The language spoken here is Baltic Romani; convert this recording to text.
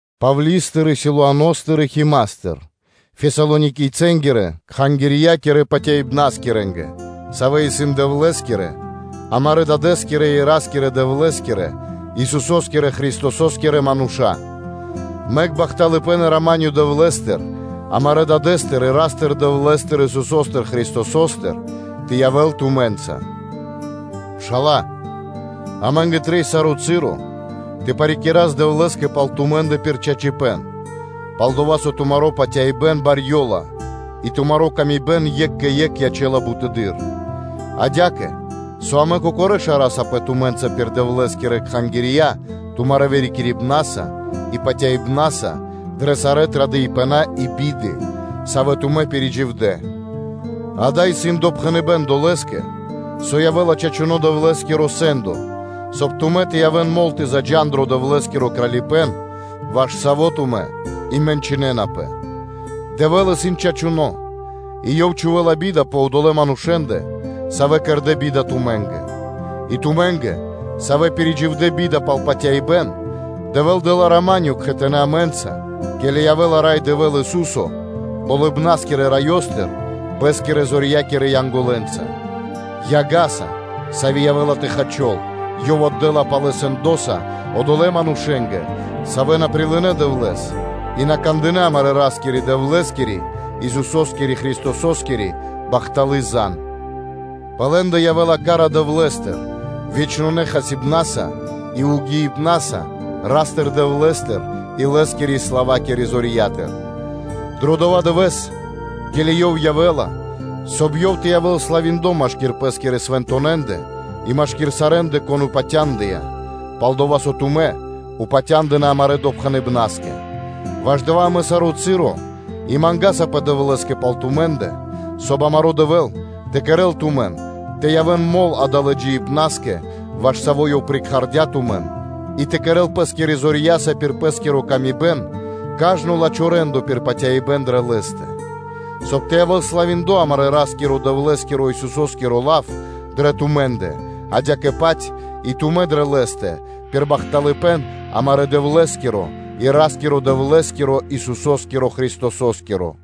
Павли́стыр, Силуаностыр и Химастыр (Тимофеёстыр) Фесалоникийцэнгирэ-кхангирья́кирэ патяибнаскирэнгэ, савэ́ исын Дэвлэ́скирэ, амарэ́ Дадэ́скирэ и Ра́скирэ-Дэвлэ́скирэ, Исусо́скирэ Христосо́скирэ мануша́. Мэк бахталыпэ́н и рама́нё Дэвлэ́стыр амарэ́ Дадэ́стыр и Ра́стыр-Дэвлэ́стыр, Исусо́стыр Христосостыр тэ явэ́л тумэ́нца. Пшала́лэ, амэ́нгэ трэй саро́ часо тэ парикирас Дэвлэ́скэ пал тумэ́ндэ пир чачипэ́н, пал-дова́ со тумари́ паты́в кэ яви́р мануша́ барьёла и тумари́ паты́в екх кэ екх ячэ́ла бутэды́р; адя́кэ, со амэ кокорэ́ шарасапэ тумэ́нца пир Дэвлэ́скирэ кхангирья тумарэ́ вырикирибнаса и патяибна́са дрэ сарэ́ традыпэна и биды, савэ́ тумэ́ пиридживдэ; дава́ исын допхэныбэ́н долэ́скэ, со явэ́ла чачуно́ Дэвлэ́скиро сэ́ндо, соб (кай) тумэ́ тэ явэ́н мол тэ заджа́н дро Дэвлэ́скиро Кралипэ́н, ваш саво́ тумэ́ и мэнчынэнапэ; Дэвэ́л исын чачуно́, и Ёв чхувэ́ла би́да пэ одолэ́ манушэ́ндэ, савэ́ кэрдэ́ би́да тумэ́нгэ; и тумэ́нгэ, савэ́ пиридживдэ би́да пал патяибэ́н, Дэвэ́л дэ́ла рама́нё (миро) кхэтанэ́ амэ́нца, ке́ли явэ́ла Рай Дэвэ́л, Ису́со Болыбна́скирэ Раёстыр, Лэ́скирэ зорьякирэ Янголэнца, яга́са, сави́ явэ́ла тэ хачол, Ёв отдэ́ла палэ сэндоса одолэ́ манушэ́нгэ, савэ́ на прилынэ́ Дэвлэ́с и на кандынэ́ амарэ́ Ра́скирэ-Дэвлэ́скири, Исусо́скирэ Христососкири бахталы́ зан (звесь); пэ лэ́ндэ явэ́ла ка́ра Дэвлэ́стыр вечнонэ хасибнаса и угиибнаса Ра́стыр-Дэвлэ́стыр и Лэ́скирэ славакирэ зорья́тыр: дро дова́ дывэ́с, ке́ли Ёв явэ́ла, соб (кай) Ёв тэ явэ́л славиндло машки́р Пэ́скирэ свэнтонэндэ и машки́р сарэ́ндэ, кон упатяндыя, пал-дова́ со тумэ́ упатя́ндынэ амарэ́ допхэныбнаскэ. Ваш дава́ амэ саро́ часо и мангасапэ Дэвлэ́скэ пал тумэ́ндэ, соб (кай) амаро́ Дэвэ́л тэ кэрэ́л тумэн тэ явэ́н мол далэ́ джиибнаскэ, ваш саво́ Ёв прикхардя тумэн и тэ кэрэ́л Пэ́скирэ зорья́са пир Пэ́скири ла́ска кажно лачхо́ рэ́ндо пир патяибэ́н дрэ Лэ́стэ, соб (кай) тэ явэ́л славиндло амарэ́ Ра́скирэ-Дэвлэ́скиро Исусо́скиро лав дрэ тумэ́ндэ, адя́кэ-паць и тумэ́ дрэ Лэ́стэ пир бахталыпэ́н амарэ́ Дэвлэ́скиро и Ра́скирэ-Дэвлэ́скиро, Исусо́скирэ Христосо́скиро.